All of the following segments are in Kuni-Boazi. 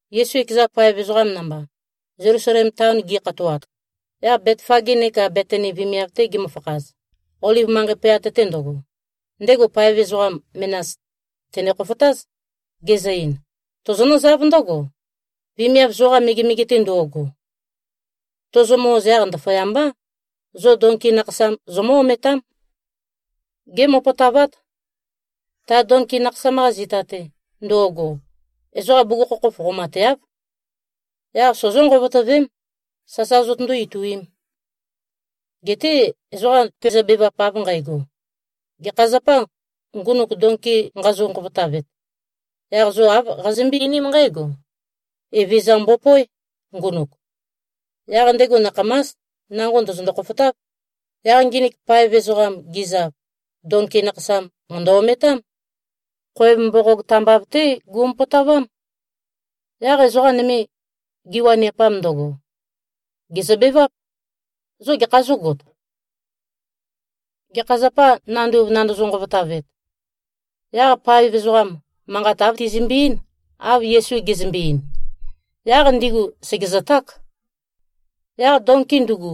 Yesu ekeza paev ezoqam namba, Zelusalem taon gi꞉khatoat, yaq Betfage neka Betani vemiav-te gimøfakhaz, Oliv manqei pøyat-te ndøgo, ndego paev ezoqa menas tène-khofotáz, gezø-ein, “Tozonǿzáv ndǿgo, vemiav zoqa megemege-te ndo꞉go. Tozomø-oz, yaq ndaføyambá, zo donki nakhasam zomǿ-ometám. Gémopotavát. Ta donki nakhasam-qa zita-te ndo꞉go, ezoqam bugukhokhof qomateáv. Yaq sozó-nqovotøvém, sasa zotøndó-ituīm. Geté ezoqa tezøbevap av nqægo, ‘Gekha zapâ, ngunuk donki nqazo-nqovotavet?’ Yaq zo āv qazømbøé-einím nqǽgo, ‘Evezøza mbopóe, ngunuk. Yaq ndego nakhamás, nango ndø̀zøndo-khofotáv.’” Yaq nginik paev ezoqam gizav, donki nakhasam mø̀ndø-ometám. Khoev mboqog tambav-té gumopotavám. Yaq ezoqa nøme, giwaniapam ndøgo, gèzøbeváp, “Zo gekhā zógot? Gekha zapâ, nanduv nandozo-nqovotavet?” Yaq paev ezoqam, manqat āv tizimbi-eín, av Yesu gezømbe-ein. Yaq ndigu sègezøták. Yaq donki ndugu,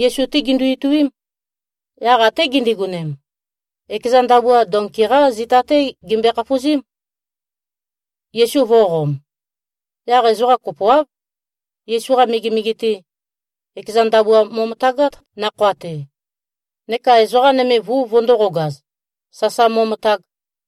Yesu-té gindu-ituím. Yaq até gindigonem, ekeza ndabua donki-qá zita-té gimbøe-khafuzím, Yesu vō꞉qom. Yaq ezoqa kopoáv, Yesu-qa megemege-te, ekeza ndabua mo꞉møtagát, nakhoa-te, neka ezoqa nøme vuv vøndōqogaz, sasa mo꞉møtag.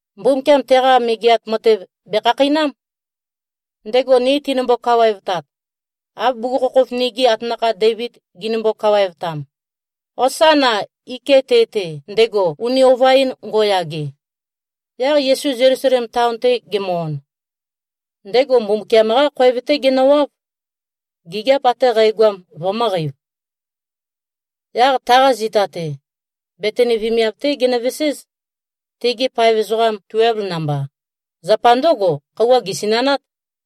Mbumbukiam teqa Megeat Matev bèkhakheinám, ndego ni tenimbo-kawaevtat, av bugukhokhof nigi atanakha Deivid ginimbo-kawaevtam. Hosána! Iké꞉ te-te, ndego uni ova-in ngo꞉yage!” Yaq Yesu Zelusalem taon-te gemø-on, ndego Mbumbukiam-qá khoev-té genøwáv, gigiap ate qægoam vømø̄qeiv. Yaq taqa zita-te, Betani vemiav-té genøveséz, tegi paev ezoqam tuelv namba. Zapa ndǿgo, khøuwa gèsinanát.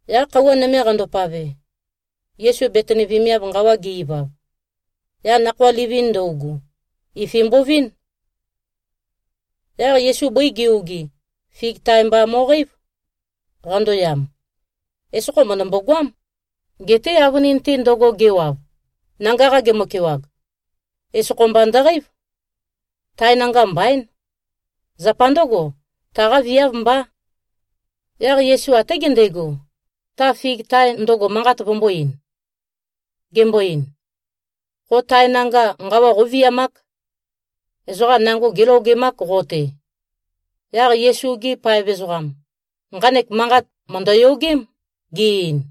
Yaq khøuwa nøme qandopave, Yesu Betani vemiav nqawa ge-ivav, yaq nakhoa livin ndøugu, ifi mbovín. Yaq Yesu bøi ge-ogi, fig tae mba mo꞉qeív, qandoyam. Esokho mø̀ndømbo-goám. Geté avønin-te ndøgo gewav, nanga-qa gemøkewag, esokho mba ndøqeív. Tae nanga mbaín. Zapa ndǿgo, taqá viáv mbá. Yaq Yesu até gendego, ta fig tae ndøgo manqat vømbō-ein. Gembo-ein, “Qo tae nanga nqawa qóviamák. Ezoqa nango gélogemák qo-te.” Yaq Yesu-gi paev ezoqam, nqanek manqat mø̀ndøyogém, ge-ein.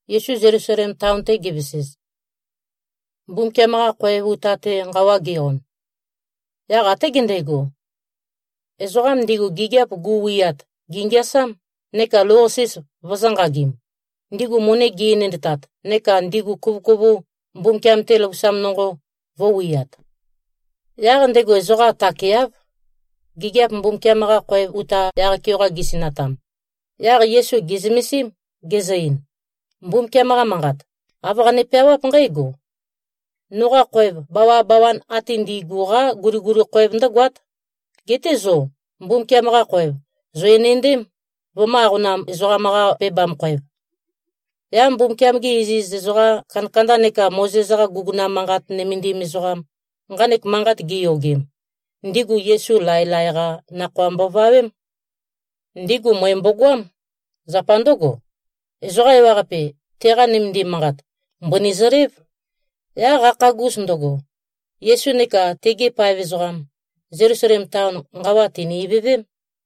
Yesu Zelusalem taon-te gevesez, Mbumbukiam-qa khoev uta-te nqawa ge-on, yaq até gendego, ezoqam ndigu gigiap gu꞉wiat, gèngeasám, neka lou-qasis vøzø̄-nqagim, ndigu møni gi꞉-enendtat neka ndigu kuvøkuvu, Mbumbukiam-te løvusam nonqo, vø̄wiat. Yaq ndego ezoqa takeáv, gigiap Mbumbukiam-qa khoev uta yaq-keoqa gisinatam. Yaq Yesu gè꞉zømesím, gezø-ein, “Mbumbukiam-qa Manqat, āv qane-peawáp nqǽgo, ‘Noqa khoev, bawabawan ate ndi꞉gu-qá guliguli khoev ndǿgoát.’ Geté zo Mbumbukiam-qa khoev zò-enendém, vømø̄-aqonam-ezoqam-qa-pebam-khoev.” Yaq Mbumbukiam-gi iziz ezoqa kandakanda neka Mozes-qa guguna manqat nømendim ezoqam, nqanek manqat giyogem, ndigu Yesu laelae-qá nakhoa mbovawém. Ndigu møe mbogoám. Zapa ndǿgo, ezoqa ewaqape, teqa nømendim manqat, mbøni zølév. Yaq qakhagus ndøgo, Yesu neka tegi paev ezoqam, Zelusalem taon nqawa tìni-ivøvém.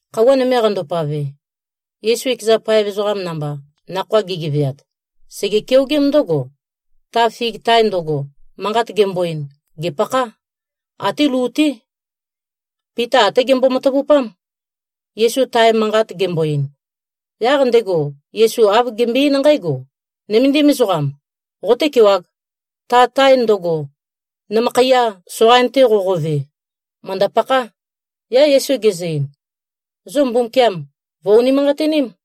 Khøuwa nøme qandopave, Yesu ekeza paev ezoqam namba nakhoa gigeveat, sège-keogém ndǿgo, ta fig tae ndøgo, manqat gembo-ein, gèpakhá. Até lu-té. Pita até gembo-matavupám, Yesu tae manqat gembo-ein. Yaq ndego Yesu āv gembøe-eín nqǽgo, “Nøméndim ezoqam. Qotékewāg. Ta tae ndøgo, nømøkhaiya soqain-te qoqove, mø̀ndø-pakhá!” Yaq Yesu gezø-ein, “Zo Mbumbukiam vø̀-unimanqatiním.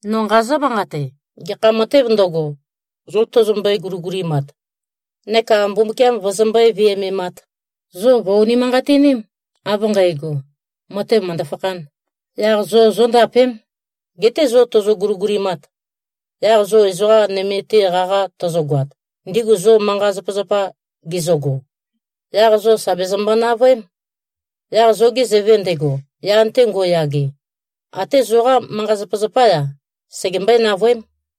No nqazǿ-manqate. Gekha matēv ndøgo, zo tozombøe-guligulimat neka Mbumbukiam vøzømbøé-viømemāt, zo vø̀-unimanqatiním, av nqægo, matev mø̀ndø-fakhān. Yaq zo zóndapém. Geté zo tozo-guligulimat, yaq zo ezoqa nøme-te qaqa tøzøgoat, ndigu zo manqa-zapazapa gizøgo, yaq zo sà bezømbo-navøém. Yaq zoge Zøve ndego, yan-te ngo꞉yage, até zoqá manqa-zapazapá-ya, segembøé-navøém.”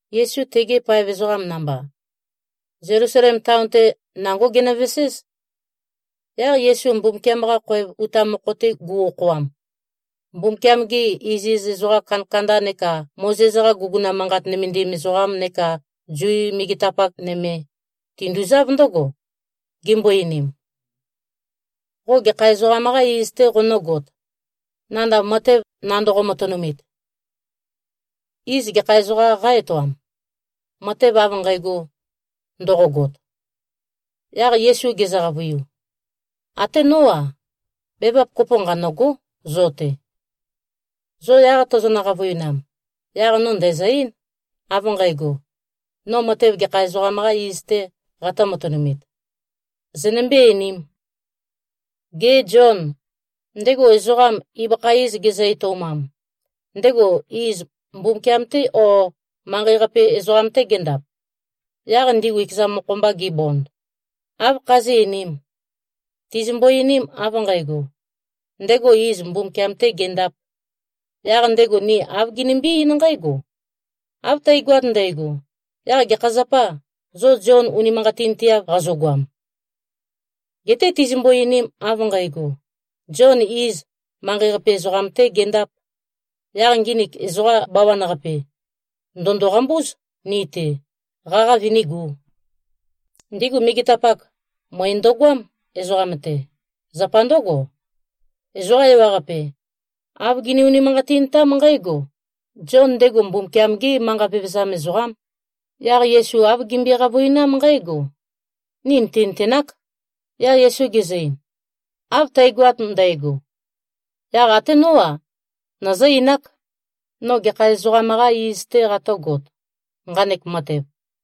Yesu tegi paev ezoqam namba, Zelusalem taon-te, nangó ginøveséz. Yaq Yesu Mbumbukiam-qa khoev uta mokho-te gu꞉-okhoam, Mbumbukiam-gi iziz ezoqa kandakanda neka Mozes-qa guguna manqat nømendim ezoqam neka Zu megetapak nøme, tinduzáv ndǿgo, gimbo-einim, “Qo gekha ezoqam-qâ iz-tē qonǿgot, nandav matev nandoqo-matønumit? Iz gekha ezoqām qá-etoam, matev av nqægo ndoqogot?” Yaq Yesu gezø-qavøiu, “Até nó-a, bevap kopo nqanø̂gó, zo-te. Zo yaq tozonø-qavøinam, yaq no ndæ̀zø-eín, av nqægo, no matev gekha ezoqam-qā iz-tē qatø̄-matønumit. Zønømbé-einīm. Gê, Zion, ndego ezoqam ibøkha iz gezø-etoumam, ndego iz Mbumbukiam-tê, ó, manqei-qape ezoqam-tê gendap?” Yaq ndigu ekeza mokho-mba gibond, “Áv khazí꞉-einīm? Tizimbo-einim av nqægo, ‘Ndego iz Mbumbukiam-tē gendāp,’ yaq ndego ni āv ginimbí-eín nqǽgo, ‘Av tægoat ndægo, yaq gekha zapâ, zo Zion unimanqatinteav qazogoam?’ Geté tizimbo-einim av nqægo, ‘Zion, iz, manqei-qape ezoqam-tē gendāp,’ yaq nginik ezoqa bawan-qape, ndø̀ndo-qambúz ni-te, qaqa vønígū.” Ndigu megetapak, møe ndøgoám, ezoqam-te. Zapa ndǿgo, ezoqa ewaqape, āv gini-unimanqatintám nqǽgo: Zion, ndego Mbumbukiam-gé manqa vevezam ezoqám. Yaq Yesu āv gimbøe-qavøinám nqǽgo, “Ni nìtinøtenák.” Yaq Yesu gezø-ein, “Av tægoat ndægo, yaq até nó-a, nøzǿ-einák, no gekha ezoqam-qā iz-tē qatø̄got, nqanek matev.”